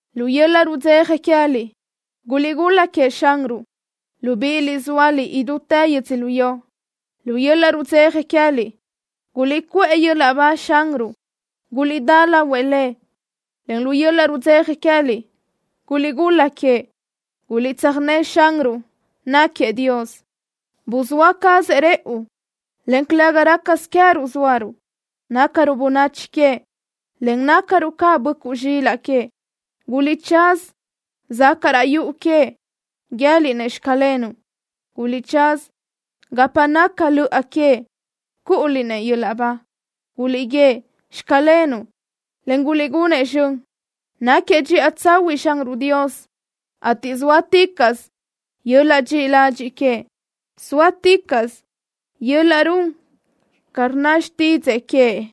¡Lu yöl-laʼ rudzeja queë́liʼ guliʼgul-la queëʼ Xanruʼ, libíʼiliʼ zóaliʼ idútë yödzölió! ¡Lu yöl-laʼ rudzeja queë́liʼ guliʼcuʼë yöl-laʼ ba Xanruʼ! ¡Guliʼdá lahuëʼ Lëʼ, en lu yöl-laʼ rudzeja queë́liʼ guliʼgul-la queëʼ! ¡Guliʼtsöjné Xanruʼ, náquiëʼ Dios! Buzáʼ cazëʼ rëʼu, en calëga rácasö queë́ruʼ zóaruʼ. Nácaruʼ bönachi queëʼ, en nácaruʼ ca böʼcuʼ zxilaʼ queëʼ. Guliʼtsaza zacaʼ raʼ yuʼu queëʼ, guië́liʼ-nëʼ: “Xclenuʼ.” Guliʼtsaza gapa naca löʼa queëʼ, cúʼuliʼ-nëʼ yöl-laʼ ba. Guliʼguíëʼ: “Xclenuʼ”, en guliʼgunëʼ zxön. ¡Náquiëʼ dxiʼa tsahuiʼ Xanruʼ Dios, ateʼ zóaticaʼsö yöl-laʼ dxiʼi ladxiʼ queëʼ! ¡Zóaticaʼsö yöl-laʼ run ca rnna xtídzëʼë queëʼ!